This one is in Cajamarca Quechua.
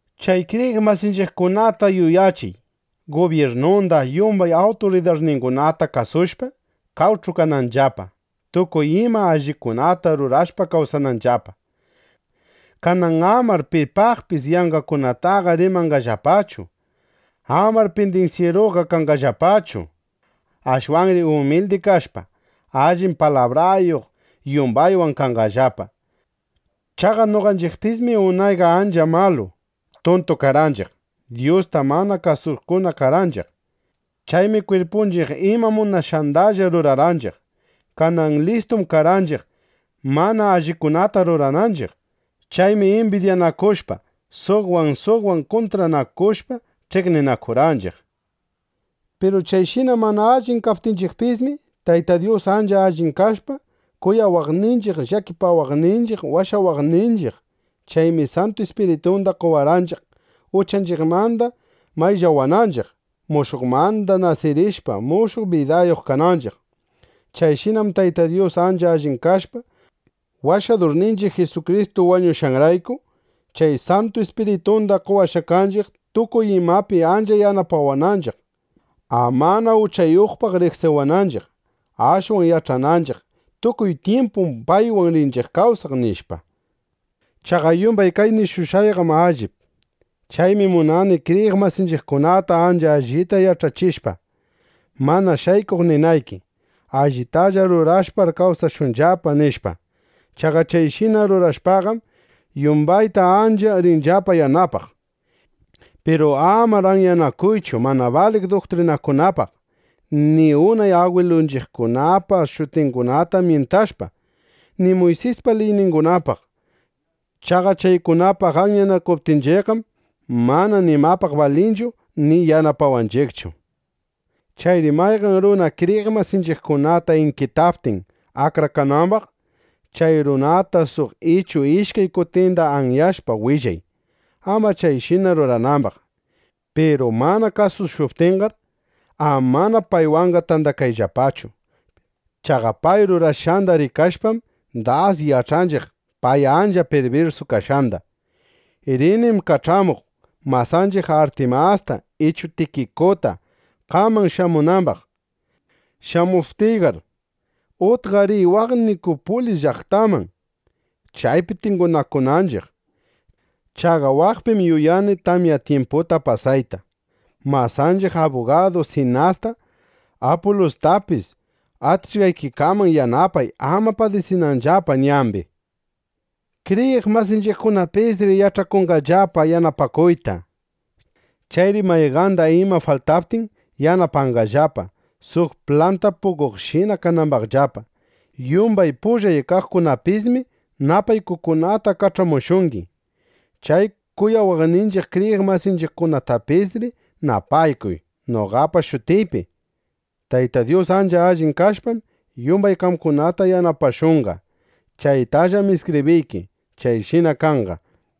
Chay kriyiq masinchiqkunata yuyachiy, gubyirnunda, yumbay awturidarningunata kasushpa, qawch'u kananllapa, tukuy ima allikunata rurashpa kawsananllapa. Kanan amar pipaqpis yanqakunataqa rimanqallapachu. Amar pindinsyiruqa kanqallapachu. Ashwanri umildi kashpa, allin palabrayuq yumbaywan kanqallapa. Chaqa noqanchiqpismi unayqa ancha malu, tuntu karqanchiq. Dyusta mana kasuqkunam karqanchiq. Chaymi kwirpunchiq ima munashqandalla rurarqanchiq. Kanan listum karqanchiq, mana allikunata rurananchiq. Chaymi imbidyanakushpa, suqwan, suqwan kuntranakushpa, ch'iqninakurqanchiq. Piru chayshina mana allin kaptinchiqpismi, Tayta Dyus ancha allin kashpa, kuyawaqninchiq, llakipawaqninchiq washawarqanchiq. Chaymi Santu Ispiritunda qowarqanchiq, uchanchiqmanda mayllawananchiq, mushuqmanda nasirishpa, mushuq bidayuq kananchiq. Chayshinam Tayta Dyus ancha allin kashpa, Washadurninchiq Jisukristu wañushqanrayku, chay Santu Ispiritunda qowashqa kanchiq, tukuy imapi ancha yanapawananchiq, amana uchayuqpaq riqsiwananchiq, ashwan yach'ananchiq: Tukuy tyimpum paywan rinchiq kawsaq, nishpa. Chaqa yumbay kay nishushqayqam allip. Chaymi munani kriyiq masinchiqkunata ancha allita yach'achishpa, mana shaykuq ninayki: Allitalla rurashpar kawsashunllapa, nishpa. Chaqa chayshina rurashpaqam, yumbayta ancha rinllapa yanapaq. Piru amar anyanakuychu mana baliq duktrinakunapaq, ni unay agwilunchiqkunapa shutingunata myintashpa, ni Muysispa liyningunapaq. Chaqa chaykunapaq anyanakunanchiqqam mana nimapaq balinchu, ni yanapawanchiqchu. Chayri mayqan runa kriyiq masinchiqkunata inkitaptin akrakanambaq, chay runata suq ichu ishkay kutinda anyashpa willay, ama chayshina ruranambaq. Piru mana kasushuptinqar, amana paywanqa tandakayllapachu. Chaqa pay rurashqanda rikashpam, das yach'anchiq pay ancha pirbirsu kashqanda. Rinim kach'amuq masanchiq Artimasta ichu Tikikuta, qaman shamunambaq. Shamuptinqar, utqa riy waq Nikupulis llaqtaman, chaypi tingunakunanchiq. Chaqa waqpim yuyani tamya tyimputa pasayta. Masanchiq abugadu Sinasta, Apulustapis atishqaykikaman yanapay, ama padisinanllapa ñambi. Kriyiq masinchiqkunapisri yach'akunqallapa yanapakuyta. Chayri mayqanda ima faltaptin, yanapanqallapa, suq planta puqoqshina kanambaqllapa. Yumbay pullay kaqkunapismi napaykukunata kach'amushungi. Chay kuyawaqninchiq kriyiq masinchiqkunatapisri napaykuy noqapa shutiypi. Tayta Dyus ancha allin kashpam, yumbay qamkunata yanapashunqa. (Chaytallam iskibriyki.) Chayshina kanqa.